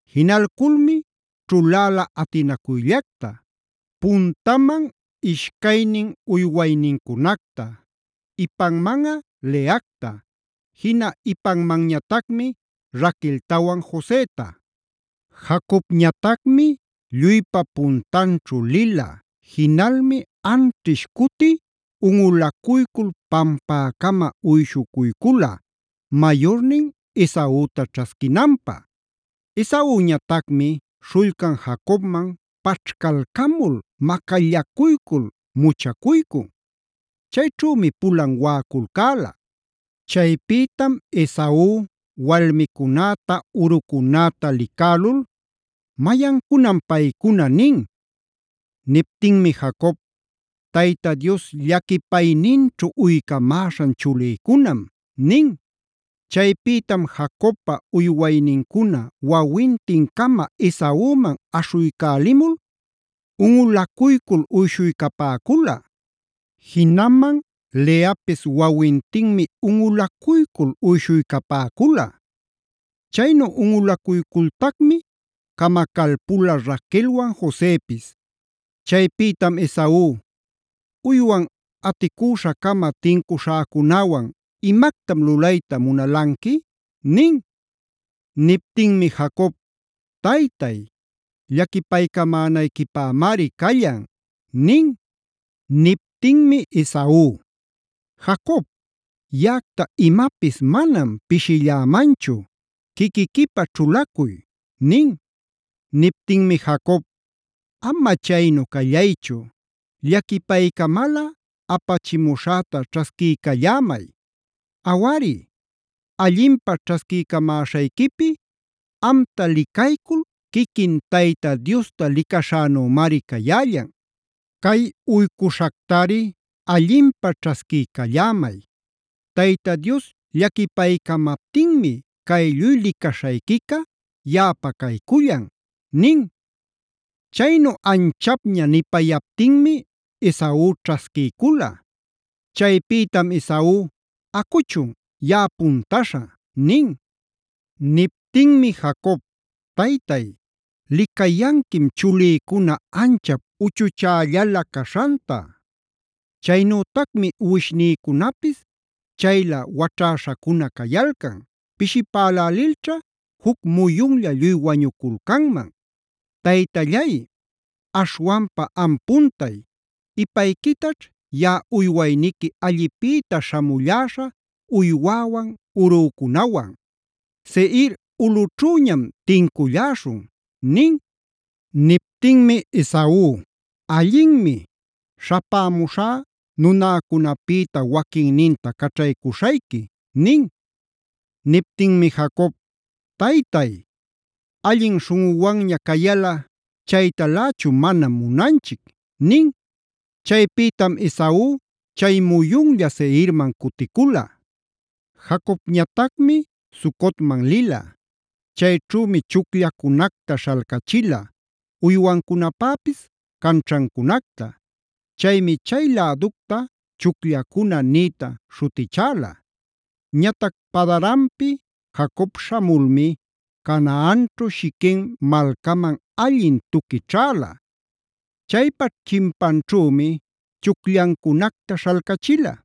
Jinalculmi ćhuläla atinacuyllacta: Puntaman ishcaynin uywaynincunacta, ipanmanꞌa Leacta, jina ipanmanñatacmi Raqueltawan Joseta. Jacobñatacmi lluypa puntanćhu lila, jinalmi anćhish cuti unꞌulacuycul pampäcama uyshuycula mayurnin Esauta ćhasquinanpä. Esauñatacmi śhullcan Jacobman paćhcalcamul macallacuycul muchacuycun. Chayćhümi pulan waꞌaculcäla. Chaypïtam Esau walmicunäta urucunäta licälul: “¿Mayancunam paycuna?” nin. Niptinmi Jacob: “Tayta Dios llaquipayninćhu uycamäśhan chulïcunam” nin. Chaypïtam Jacobpa uywaynincuna wawintin-cama Esauman aśhuycälimul unꞌulacuycul uyshuycapäcula. Jinaman Leapis wawintinmi unꞌulacuycul uyshuycapäcula. Chaynu unꞌulacuycultacmi camacalpula Raquelwan Josepis. Chaypïtam Esau: “¿Uywan aticüśha-cama tincuśhäcunäwan imactam lulayta munalanqui?” nin. Niptinmi Jacob: “Taytay, llaquipaycamänayquipämari callan” nin. Niptinmi Esau: “Jacob, yaꞌacta imapis manam pishillämanchu; quiquiquipä ćhulacuy” nin. Niptinmi Jacob: “Ama chaynu callaychu, llaquipaycamalꞌa apachimuśhäta ćhasquiycallämay. Awari, allinpä ćhasquiycamäśhayquipi ¡amta licaycul quiquin Tayta Diosta licaśhänümari cayällan! Cay uycuśhactari allinpä ćhasquiycallämay; Tayta Dios llaquipaycamaptinmi cay lluy licaśhayquica yaꞌapa caycullan” nin. Chaynu anchapña nipayaptinmi Esau ćhasquiycula. Chaypïtam Esau: “Acuchun, yaꞌa puntaśha” nin. Niptinmi Jacob: “Taytay, licayanquim chulïcuna anchap uchuchällala caśhanta. Chaynütacmi uwishnïcunapis chayla waćhäśhacuna cayalcan, pishipälälilćha juc muyunlla lluy wañuculcanman. Taytallay, aśhwanpa am puntay; ipayquitaćh yaꞌa uywayniqui allipïta śhamulläśha uywäwan, urücunawan; Seir ulꞌućhüñam tinculläśhun” nin. Niptinmi Esau: “Allinmi, śhapämuśhá nunäcunapïta waquinninta caćhaycuśhayqui” nin. Niptinmi Jacob: “Taytay, allin śhunꞌuwanña cayalꞌa chaytalächu manam munanchic” nin. Chaypïtam Esau chay muyunlla Seirman cuticula. Jacobñatacmi Sucotman lila. Chayćhümi chucllacunacta śhalcachila, uywancunapäpis canćhancunacta. Chaymi chay läducta “chucllacuna” nïta śhutichäla. Ñatac Padan-arampi Jacob śhamulmi Canaanćhu Shiquem malcaman allin tuqui ćhäla. Chaypa chimpanćhümi chucllancunacta śhalcachila.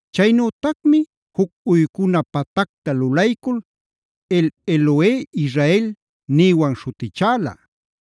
Chaynütacmi juc uycuna patacta lulaycul “El-Elohe-Israel” nïwan śhutichäla.